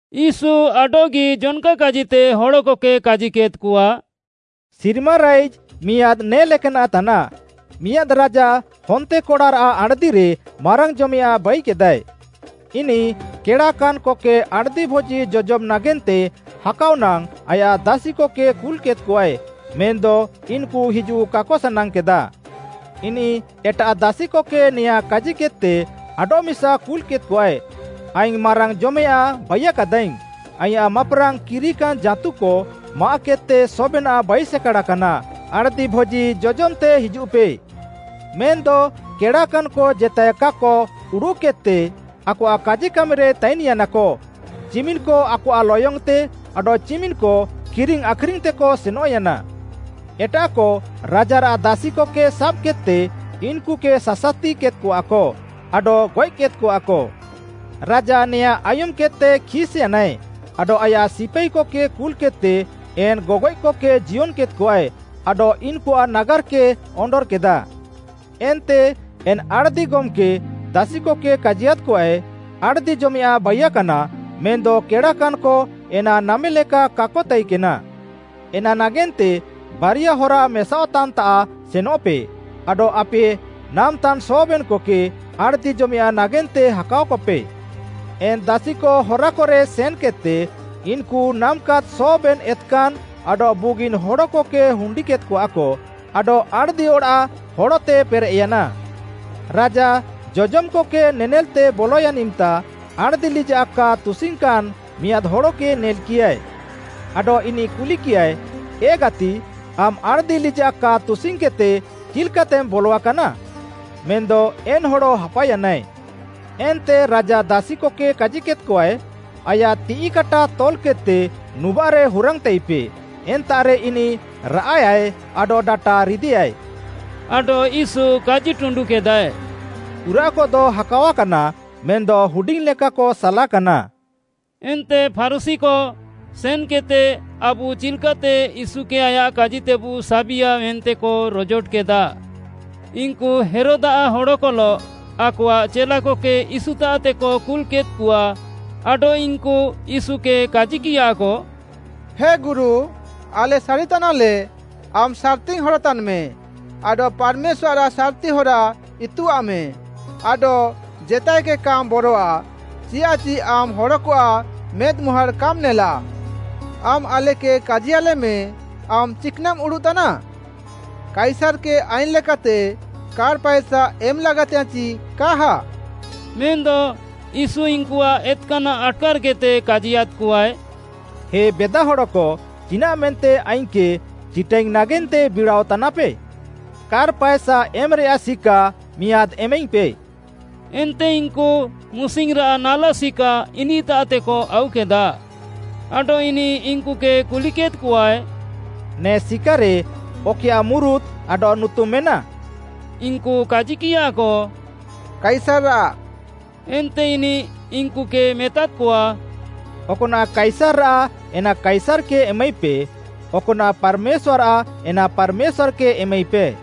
ୟୀଶୁ ଆଡଃଗି ଜନ୍‌କା କାଜିତେ ହଡ଼କକେ କାଜିକେଦ୍‌କଆ। “ସିର୍ମା ରାଇଜ୍‌ ମିଆଁଦ୍‌ ନେ ଲେକାନାଃ ତାନାଃ। ମିଆଁଦ୍‌ ରାଜା ହନ୍ତେକଡ଼ାରାଃ ଆଣ୍‌ଦିରେ ମାରାଙ୍ଗ୍‌ଜମେୟାଁଃ ବାଇକେଦାଏ। ଇନିଃ କେଡ଼ାକାନ୍‍କକେ ଆଣ୍‌ଦି ଭୋଜି ଜଜମ୍‌ ନାଗେନ୍ତେ ହାକାଅ ନାଙ୍ଗ୍‌ ଆୟାଃ ଦାସିକକେ କୁଲ୍‌କେଦ୍‌କଆଏ ମେନ୍‌ଦ ଇନ୍‌କୁ ହିଜୁଃ କାକ ସାନାଙ୍ଗ୍‌କେଦା। ଇନିଃ ଏଟାଃ ଦାସିକକେ ନେଆଁଁ କାଜିକେଦ୍‌ତେ ଆଡଃମିସା କୁଲ୍‌କେଦ୍‌କଆଏ, ‘ଆଇଙ୍ଗ୍‌ ମାରାଙ୍ଗ୍‌ଜମେୟାଁଃ ବାଇୟାକାଦାଇଙ୍ଗ୍‌, ଆଇଁୟାଃ ମାପ୍‌ରାଙ୍ଗ୍‌ କିରିକାନ୍‌ ଜାଁତୁକ ମାଆଃକେଦ୍‌ତେ ସବେନାଃ ବାଇସେକାଡ଼ାକାନା, ଆଣ୍‌ଦି ଭୋଜି ଜଜମ୍‌ତେ ହିଜୁଃପେ।’ ମେନ୍‌ଦ କେଡ଼ାକାନ୍‌କ ଜେତାଏ କାକ ଉଡ଼ୁଃକେଦ୍‌ତେ ଆକଆଃ କାଜିକାମିରେ ତାଇନ୍‌ୟାନାକ, ଚିମିନ୍‌କ ଆକଆଃ ଲୟଙ୍ଗ୍‌ତେ, ଆଡଃ ଚିମିନ୍‍କ କିରିଙ୍ଗ୍‌ ଆଖ୍‌ରିଙ୍ଗ୍‌ତେକ ସେନଃୟାନା। ଏଟାଃକ ରାଜାରାଃ ଦାସିକକେ ସାବ୍‌କେଦ୍‌ତେ ଇନ୍‌କୁକେ ସାସାତିକେଦ୍‌କଆକ ଆଡଃ ଗଏଃକେଦ୍‍କଆକ। ରାଜା ନେଆଁଁ ଆୟୁମ୍‌କେଦ୍‌ତେ ଖିସ୍‍ୟାନାଏ ଆଡଃ ଆୟାଃ ସିପାଇକକେ କୁଲ୍‍କେଦ୍‍ତେ ଏନ୍‍ ଗଗଏଃକକେ ଜିୟନ୍‌କେଦ୍‌କଆଏ ଆଡଃ ଇନ୍‌କୁଆଃ ନାଗାର୍‌କେ ଅଣ୍ଡର୍‌କେଦା। ଏନ୍ତେ ଏନ୍‌ ଆଣ୍‌ଦି ଗମ୍‌କେ ଦାସିକକେ କାଜିୟାଦ୍‌କଆଏ, ‘ଆଣ୍‌ଦି ଜମେୟାଃଁ ବାଇୟାକାନା ମେନ୍‌ଦ କେଡ଼ାକାନ୍‌କ ଏନା ନାମେଲେକା କାକ ତାଇକେନା। ଏନା ନାଗେନ୍ତେ ବାରିଆ ହରା ମେସାଅଃତାନ୍‌ତାଃ ସେନଃପେ ଆଡଃ ଆପେ ନାମ୍‍ତାନ୍‍ ସବେନ୍‌କକେ ଆଣ୍‌ଦି ଜମେୟାଃଁ ନାଗେନ୍ତେ ହାକାଅକପେ।’ ଏନ୍‍ ଦାସିକ ହରାକରେ ସେନ୍‌କେଦ୍‌ତେ ଇନ୍‌କୁ ନାମ୍‍କେଦ୍‍ ସବେନ୍‌ ଏତ୍‌କାନ୍‍ ଆଡଃ ବୁଗିନ୍‌ ହଡ଼କକେ ହୁଣ୍ଡିକେଦ୍‍କଆକ ଆଡଃ ଆଣ୍‌ଦି ଅଡ଼ାଃ ହଡ଼ତେ ପେରେଃୟାନା। “ରାଜା ଜଜମ୍‌କକେ ନେନେଲ୍‍ତେ ବଲୟାନ୍‌ ଇମ୍‌ତା, ଆଣ୍‌ଦି ଲିଜାଃ କା ତୁସିଙ୍ଗ୍‌କାନ୍‌ ମିଆଁଦ୍‌ ହଡ଼କେ ନେଲ୍‌କିୟାଏ। ଆଡଃ ଇନିଃ କୁଲିକିୟାଏ, ‘ଏ ଗାତି, ଆମ୍‌ ଆଣ୍‌ଦି ଲିଜାଃ କା ତୁସିଙ୍ଗ୍‌କେଦ୍‌ତେ ଚିଲ୍‌କାତେମ୍ ବଲଆକାନା?’ ମେନ୍‌ଦ ଏନ୍‌ ହଡ଼ ହାପାୟାନାଏ। ଏନ୍ତେ ରାଜା ଦାସିକକେ କାଜିକେଦ୍‌କଆଏ, ‘ଆୟାଃ ତିଃଇ କାଟା ତଲ୍‌କେଦ୍‌ତେ ନୁବାଃରେ ହୁରାଙ୍ଗ୍‌ତାଇପେ, ଏନ୍ତାଃରେ ଇନିଃ ରାଆଃୟାଏ ଆଡଃ ଡାଟା ରିଦେୟାଏ।’” ଆଡଃ ୟୀଶୁ କାଜିଟୁଣ୍ଡୁକେଦାଏ, “ପୁରାଃକଦ ହାକାଅକାନା ମେନ୍‌ଦ ହୁଡିଙ୍ଗ୍‌ଲେକାକ ସାଲାକାନା।” ଏନ୍ତେ ଫାରୁଶୀକ ସେନଃକେଦ୍‌ତେ, ଆବୁ ଚିଲ୍‍କାତେ ୟୀଶୁକେ ଆୟାଃ କାଜିତେବୁ ସାବିଆ, ମେନ୍ତେକ ରଜୋଟକେଦା। ଇନ୍‌କୁ ହେରୋଦ୍‌ଆଃ ହଡ଼କଲଃ, ଆକଆଃ ଚେଲାକକେ ୟୀଶୁତାଃତେକ କୁଲ୍‌କେଦ୍‍କଆ ଆଡଃ ଇନ୍‌କୁ ୟୀଶୁକେ କାଜିକିୟାକ, “ହେ ଗୁରୁ, ଆଲେ ସାରିତାନାଲେ, ଆମ୍‌ ସାର୍‌ତିଙ୍ଗ୍‌ ହଡ଼ ତାନ୍‌ମେ ଆଡଃ ପାର୍‌ମେଶ୍ୱାର୍‌ଆଃ ସାର୍‌ତି ହରା ଇତୁଆଃମେ ଆଡଃ ଜେତାଏକେ କାମ୍‌ ବରୱା, ଚିୟାଃଚି ଆମ୍‌ ହଡ଼କଆଃ ମେଦ୍‌ମୁହାଁଡ଼୍‌ କାମ୍‌ ନେଲାଃ। ଆମ୍‌ ଆଲେକେ କାଜିୟାଲେମ୍‌, ଆମ୍‌ ଚିକ୍‌ନାଃମ୍‌ ଉଡ଼ୁଃତାନା? କାଇସାର୍‌କେ ଆଇନ୍‌ ଲେକାତେ କାର୍‌ ପାଏସା ଏମଃ ଲାଗାତିଙ୍ଗ୍‌ୟାଁଃ ଚି କାହା?” ମେନ୍‌ଦ ୟୀଶୁ ଇନ୍‌କୁଆଃ ଏତ୍‌କାନାଃ ଆଟ୍‌କାର୍‌କେଦ୍‌ତେ କାଜିୟାଦ୍‍କଆଏ, “ହେ ବେଦାହଡ଼କ ଚିନାଃ ମେନ୍ତେ ଆଇଙ୍ଗ୍‌କେ ଚିଟାଇଙ୍ଗ୍‌ ନାଗେନ୍ତେ ବିଡ଼ାଅତାନାପେ? କାର୍‌ ପାଏସା ଏମ୍‌ରେୟାଃ ସିକା ମିଆଁଦ୍‌ ଏମାଇଙ୍ଗ୍‌ପେ।” ଏନ୍ତେ ଇନ୍‌କୁ ମୁସିଙ୍ଗ୍‌ରାଃ ନାଲା ସିକା ଇନିଃତାଃତେକ ଆଉକେଦା। ଆଡଃ ଇନିଃ ଇନ୍‌କୁକେ କୁଲିକେଦ୍‌କଆଏ, “ନେ ସିକାରେ ଅକଏୟାଃ ମୁରୁତ୍‌ ଆଡଃ ନୁତୁମ୍‌ ମେନାଃ?” ଇନ୍‌କୁ କାଜିକିୟାକ, “କାଇସାର୍‌ଆଃ,” ଏନ୍ତେ ଇନିଃ ଇନ୍‌କୁକେ ମେତାଦ୍‌କଆ, “ଅକ୍‌ନାଃ କାଇସାର୍‌ଆଃ ଏନା କାଇସାର୍‌କେ ଏମାଇପେ, ଅକ୍‌ନାଃ ପାର୍‌ମେଶ୍ୱାର୍‌ଆଃ ଏନା ପାର୍‌ମେଶ୍ୱାର୍‌କେ ଏମାଇପେ।”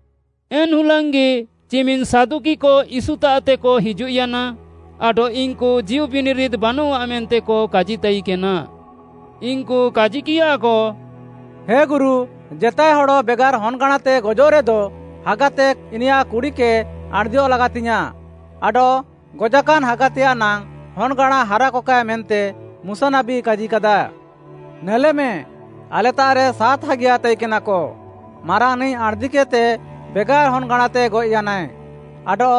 ଏନ୍‌ ହୁଲାଙ୍ଗ୍‌ଗି ଚିମିନ୍‌ ସାଦୁକିକ ୟୀଶୁତାଃତେକ ହିଜୁଃୟାନା ଆଡଃ ଇନ୍‌କୁ ଜୀଉବିନିରିଦ୍‌ ବାନଆଃ ମେନ୍ତେକ କାଜିତାଇକେନା। ଇନ୍‌କୁ କାଜିକିୟାକ, “ହେ ଗୁରୁ, ଜେତାଏ ହଡ଼ ବେଗାର୍‌ ହନ୍‌ଗାଁଣାତେ ଗଜଃରେଦ, ହାଗାତେ ଇନିୟାଃ କୁଡ଼ିକେ ଆଣ୍‌ଦିୟଃ ଲାଗାତିଙ୍ଗ୍‌ୟାଁଃ ଆଡଃ ଗଜାକାନ୍‌ ହାଗାତେୟାଃ ନାଙ୍ଗ୍‌ ହନ୍‌ଗାଁଣା ହାରାକକାଏ ମେନ୍ତେ ମୁଶା ନାବୀ କାଜିକାଦା। ନେଲେମେ, ଆଲେତାଃରେ ସାତ୍‌ ହାଗିୟା ତାଇକେନାକ ମାରାଙ୍ଗ୍‌ନିଃ ଆଣ୍‍ଦିକେଦ୍‍ତେ ବେଗାର୍‌ ହନ୍‌ଗାଁଣାତେ ଗଏଃୟାନାଏ, ଆଡଃ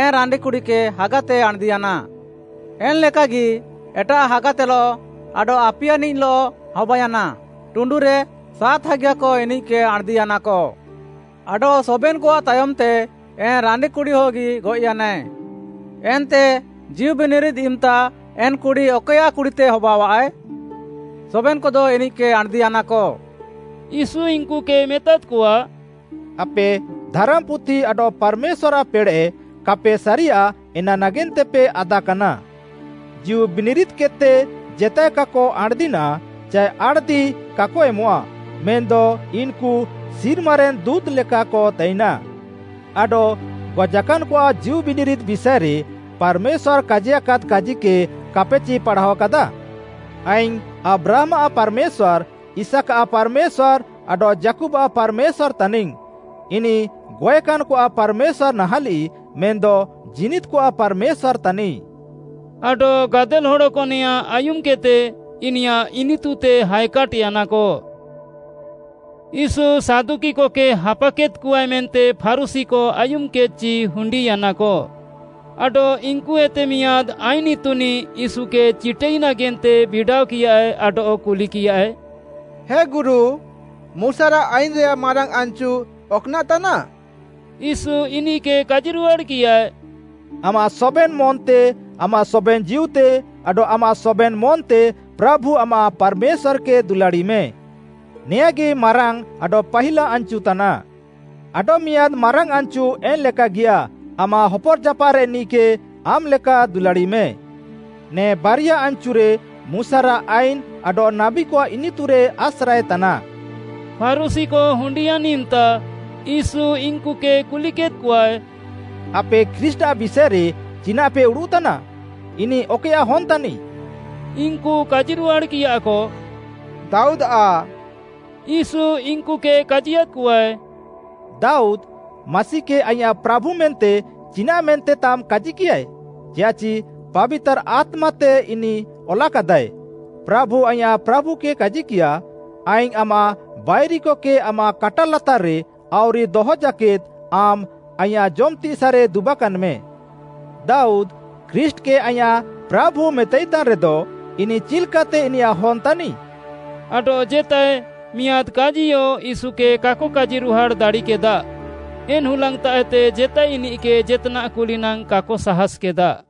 ଏନ୍‌ ରାଣ୍ଡିକୁଡ଼ିକେ ହାଗାତେ ଆଣ୍‌ଦିୟାନାଏ। ଏନ୍‌ଲେକାଗି ଏଟାଃ ହାଗାତେଲଃ ଆଡଃ ଆପିୟାନିଃଲଃ ହବାୟାନା, ଟୁଣ୍ଡୁରେ ସାତ୍‌ ହାଗିୟାକ ଇନିଃକେ ଆଣ୍‍ଦିୟାନାକ। ଆଡଃ ସବେନ୍‌କଆଃ ତାୟମ୍‌ତେ ଏନ୍‌ ରାଣ୍ଡି କୁଡ଼ିୟଗି ଗଏଃୟାନାଏ। ଏନ୍ତେ ଜୀଉବିନିରିଦ୍‌ ଇମ୍‌ତା ଏନ୍‌ କୁଡ଼ି ଅକଏୟାଃ କୁଡ଼ିତେ ହବାଅଃଆଏ? ସବେନ୍‍କଦ ଇନିଃକେ ଆଣ୍‍ଦିୟାନାକ।” ୟୀଶୁ ଇନ୍‌କୁକେ ମେତାଦ୍‌କଆ, “ଆପେ ଧାରାମ୍‌ପୁଥି ଆଡଃ ପାର୍‌ମେଶ୍ୱାର୍‌ଆଃ ପେଡ଼େଃ କାପେ ସାରିୟା ଏନା ନାଗେନ୍ତେପେ ଆଦାକାନା। ଜୀଉବିନିରିଦ୍‌କେଦ୍‌ତେ ଜେତାଏ କାକ ଆଣ୍‍ଦିନାଃ, ଚାଏ ଆଣ୍‌ଦି କାକ ଏମଃଆ, ମେନ୍‌ଦ ଇନ୍‌କୁ ସିର୍ମାରେନ୍‌ ଦୁଁତ୍‌ଲେକାକ ତାଇନାଃ। ଆଡଃ ଗଜାକାନ୍‌କଆଃ ଜୀଉବିନିରିଦ୍‌ ବିଷାଏରେ ପାର୍‌ମେଶ୍ୱାର୍‌ କାଜିୟାକାଦ୍‍ କାଜିକେ କାପେଚି ପାଢ଼ାଅକାଦା? ‘ଆଇଙ୍ଗ୍‌ ଆବ୍ରାହାମ୍‌ଆଃ ପାର୍‌ମେଶ୍ୱାର୍‌, ଇସାକ୍‌ଆଃ ପାର୍‌ମେଶ୍ୱାର୍‌ ଆଡଃ ଯାକୁବ୍‌ଆଃ ପାର୍‌ମେଶ୍ୱାର୍‌ ତାନିଙ୍ଗ୍‌।’ ଇନିଃ ଗଏଃକାନ୍‍କଆଃ ପାର୍‌ମେଶ୍ୱାର୍‌ ନାହାଁଲିଃ ମେନ୍‌ଦ ଜୀନିଦ୍‌କଆଃ ପାର୍‌ମେଶ୍ୱାର୍‌ ତାନିଃ।” ଆଡଃ ଗାଦେଲ୍‌ ହଡ଼କ ନେଆଁଁ ଆୟୁମ୍‌କେଦ୍‌ତେ ଇନିୟାଃ ଇନିତୁତେ ହାଏକାଟ୍‍ୟାନାକ। ୟୀଶୁ ସାଦୁକିକକେ ହାପାକେଦ୍‍କଆଏ ମେନ୍ତେ ଫାରୁଶୀକ ଆୟୁମ୍‌କେଦ୍‌ଚି ହୁଣ୍ଡିୟାନାକ। ଆଡଃ ଇନ୍‌କୁଏତେ ମିଆଁଦ୍‌ ଆଇନ୍‌ ଇତୁନିଃ ୟୀଶୁକେ ଚିଟାଇ ନାଗେନ୍ତେ ବିଡ଼ାଅକିୟାଏ ଆଡଃ କୁଲିକିୟାଏ, “ହେ ଗୁରୁ, ମୁଶାରାଃ ଆଇନ୍‌ରେୟାଃ ମାରାଙ୍ଗ୍‌ ଆନ୍‌ଚୁ ଅକ୍‌ନାଃ ତାନାଃ?” ୟୀଶୁ ଇନିଃକେ କାଜିରୁହାଡ଼୍‌କିୟାଏ, “‘ଆମାଃ ସବେନ୍‌ ମନ୍‌ତେ, ଆମାଃ ସବେନ୍‌ ଜୀଉତେ ଆଡଃ ଆମାଃ ସବେନ୍‌ ମନ୍‌ତେ ପ୍ରାଭୁ ଆମାଃ ପାର୍‌ମେଶ୍ୱାର୍‌କେ ଦୁଲାଡ଼ିମେ।’ ନେଆଁଁଗି ମାରାଙ୍ଗ୍‌ ଆଡଃ ପାହିଲା ଆନ୍‌ଚୁ ତାନାଃ। ଆଡଃମିଆଁଦ୍‌ ମାରାଙ୍ଗ୍‌ ଆନ୍‌ଚୁ ଏନ୍‍ଲେକାଗିୟା, ‘ଆମାଃ ହପର୍‌ଜାପାଃରେନିଃକେ ଆମାଃ ଲେକା ଦୁଲାଡ଼ିମେ।’ ନେ ବାରିୟା ଆନ୍‌ଚୁରେ ମୁଶାରାଃ ଆଇନ୍‌ ଆଡଃ ନାବୀକଆଃ ଇନିତୁରେ ଆସ୍ରାଏତାନା।” ଫାରୁଶୀକ ହୁଣ୍ଡିୟାନ୍‌ ଇମ୍‌ତା ୟୀଶୁ ଇନ୍‌କୁକେ କୁଲିକେଦ୍‌କଆଏ? “ଆପେ ଖ୍ରୀଷ୍ଟ୍‌ଆଃ ବିଷାଏରେ ଚିନାଃପେ ଉଡ଼ୁଃତାନା? ଇନିଃ ଅକଏୟାଃ ହନ୍‌ ତାନିଃ?” ଇନ୍‌କୁ କାଜିରୁହାଡ଼୍‌କିୟାକ, “ଦାଉଦ୍‌ଆଃ।” ୟୀଶୁ ଇନ୍‌କୁକେ କାଜିୟାଦ୍‍କଆଏ, “ଦାଉଦ୍‌, ମାସିକେ ‘ଆଇଁୟାଃ ପ୍ରାଭୁ’ ମେନ୍ତେ ଚିନାଃମେନ୍ତେ ତାମ୍‌ କାଜିକିୟାଏ? ଚିୟାଃଚି ପାବିତାର୍‌ ଆତ୍ମାତେ ଇନିଃ ଅଲାକାଦାଏ, “‘ପ୍ରାଭୁ ଆଇଁୟାଃ ପ୍ରାଭୁକେ କାଜିକିୟା, ଆଇଙ୍ଗ୍‌ ଆମାଃ ବାଇରିକକେ ଆମାଃ କାଟା ଲାତାର୍‌ରେ ଆଉରି ଦହକ ଜାକେଦ୍‌ ଆମ୍‌ ଆଇଁୟାଃ ଜମ୍‌ତିସାଃରେ ଦୁବାକାନ୍‌ମେ।’” “ଦାଉଦ୍‌ ଖ୍ରୀଷ୍ଟ୍‌କେ ‘ଆଇଁୟାଃ ପ୍ରାଭୁ’ ମେତାଇତାନ୍‌ରେଦ, ଇନିଃ ଚିଲ୍‍କାତେ ଇନିୟାଃ ହନ୍‌ ତାନିଃ?” ଆଡଃ ଜେତାଏ ମିଆଁଦ୍‌ କାଜିୟ ୟୀଶୁକେ କାକ କାଜିରୁହାଡ଼୍‌ ଦାଡ଼ିକେଦା, ଏନ୍‍ ହୁଲାଙ୍ଗ୍‌ତାଃଏତେ ଜେତାଏ ଇନିଃକେ ଜେତ୍‌ନାଃ କୁଲିନାଙ୍ଗ୍‌ କାକ ସାହାଁସ୍‌କେଦା।